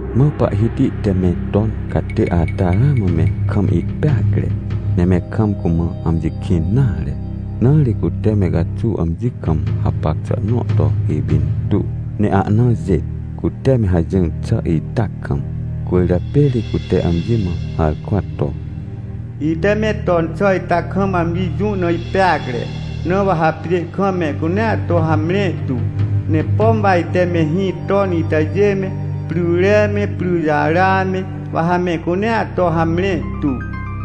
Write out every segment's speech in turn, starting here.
Mã Pahhiti te me ton catê ata ramã me kam ihpeacre, ne me kam cumã amji kĩn nare. Na ri cute me caxuw amji kam hapac xà nõ to ipintuw, ne ahna jêt, cute me hajỹr xà ita kam. Cwỳrjapê ri cute amji mã harkwa to: — Ite me ton xà ita kam amji jũ na ipeacre, na wa ha pjê kam mehcunea to hamre tu. Ne pom wa ite mehĩ ton itajê me, pryre me, pryjara me, wa ha mehcunea to hamre tu.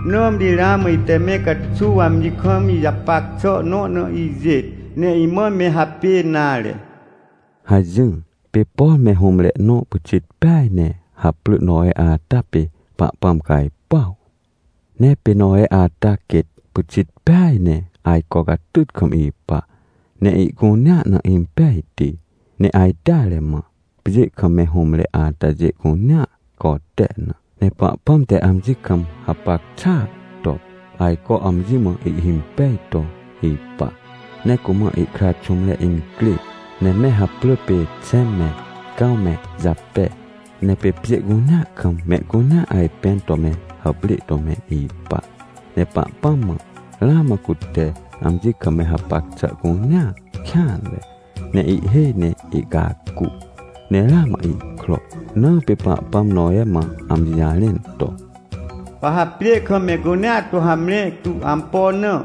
Nãmri ramã ite me caxuw amji kam ijapac xà nõ na ijêt, ne imã me hapê nare — hajỹr. Pê por me hũmre nõ pyxit peaj ne haprỳ Nowe ata pê Pahpãm cajpuaw. Ne pê Nowe ata quêt pyxit peaj ne ajco catyt kam ipa, ne ihcunea na impejti ne ajteare mã, pjê kam me hũmre atajê cunea cote na. Ne Pahpãm te amji kam hapac xàa to, ajco amji mã ihhimpej to ipa. Ne cumã ihkra xũmre incrê, ne me haprỳ pê Xẽm me, Cãw me Jape. Ne pê pjê cunea kam mehcunea ajpẽn to me hàprê to me ipa. Ne Pahpãm mã, ramã cute amji kam me hapac xà cunea kêanre, ne ihhêj ne ihcacu, ne ramã ihkro. Na pê Pahpãm Nowe mã amji jarẽn to: — Wa ha pjê kam mehcunea to hamre tu. Ampo na?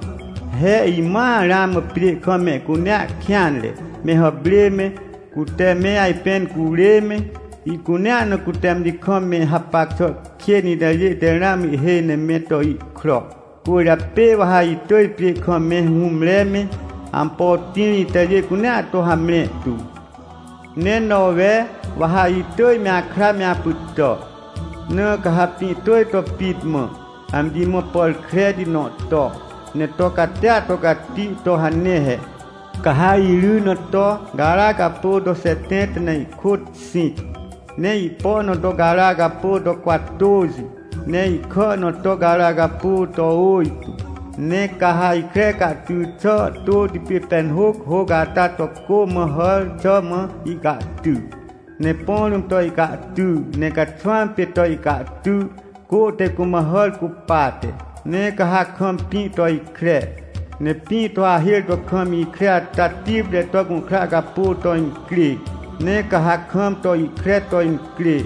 He imãa ramã pjê kam mehcunea kêanre. Me hàprê me, cute me ajpẽn curê me, ihcunea na cute amji kam me hapac xà kên itajê te ramã ihhêj ne me to ihkro. Cwỳrjapê wa ha itỳj pjê kam me hũmre me, ampo tĩr itajê cunea to hamre tu. — Ne Nowe, wa ha itỳj me akra me apytà. Na ca ha pĩ tỳj to pit mã, amji mã pàr kreti nõ to, ne to catia to cati to hane he. Ca ha iry na to gara capô to xetẽnta ne ihkôt xĩc, ne ihpo na to gara capô to cwatôxi, ne ihkà na to gara capô to ôjtô. Ne ca ha ihkre cahty xà tôti pê penhôc hôc ata to cô mã hàr xà mã ihcahty. Ne põ rũm to ihcahty, ne caxwãm pê to ihcahty, cô te cumã hàr cupate. Ne ca ha kam pĩ to ikre, ne pĩ to hahêr to kam ikre ata tipre to gũhkra capô to incrê. Ne ca ha kam to ihkre to incrê,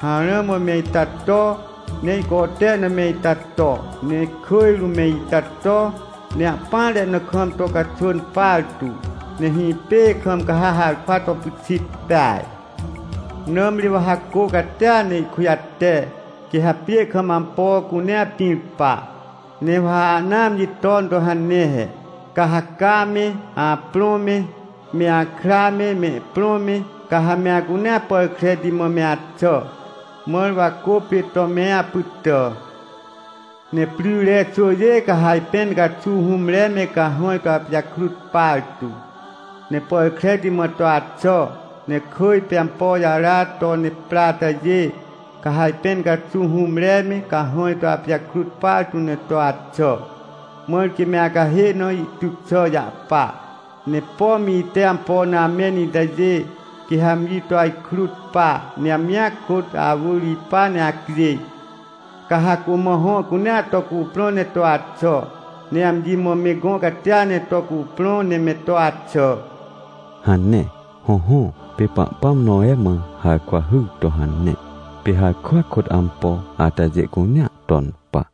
harã mã me ita to, ne ihcote na me ita to, ne kỳj rũm me ita to, ne ahpỹanre na kam to caxwỳn partu. Ne hĩpê kam ca ha harkwa to pyxit peaj. Nãmri wa ha cô catia ne ihkujate, quê ha pjê kam ampo cunea pĩr pa. — Ne wa ha ana amji ton to hane he. Ca ha ca me, aprõ me, me akra me, mehprõ me, ca ha me acunea pàr kreti mã me axà, mãr wa cô pê to me apytà. Ne pryre xwỳjê ca ha ajpẽn caxuw hũmre me cahãj to apijakrut partu, ne pàr kreti mã to axà, ne kỳj pê ampo jara to ne pra itajê, ca ha ajpẽn caxuw hũmre me cahãj to apijakrut partu ne to axà, mãr quê me acahê na ihtyc xà jahpa. Ne pom ite ampo na amẽn itajê, quê ha amji to ajkrut pa, ne amjia kôt awỳr ipa ne acjêj. Ca ha cumã hõ cunea to cuprõ ne to axà, ne amji mã me gõ catia ne to cuprõ ne me to axà — hane. Hõhõ, pê Pahpãm Nowe mã harkwa hyr to hane, pê harkwa kôt ampo atajê cunea ton pa.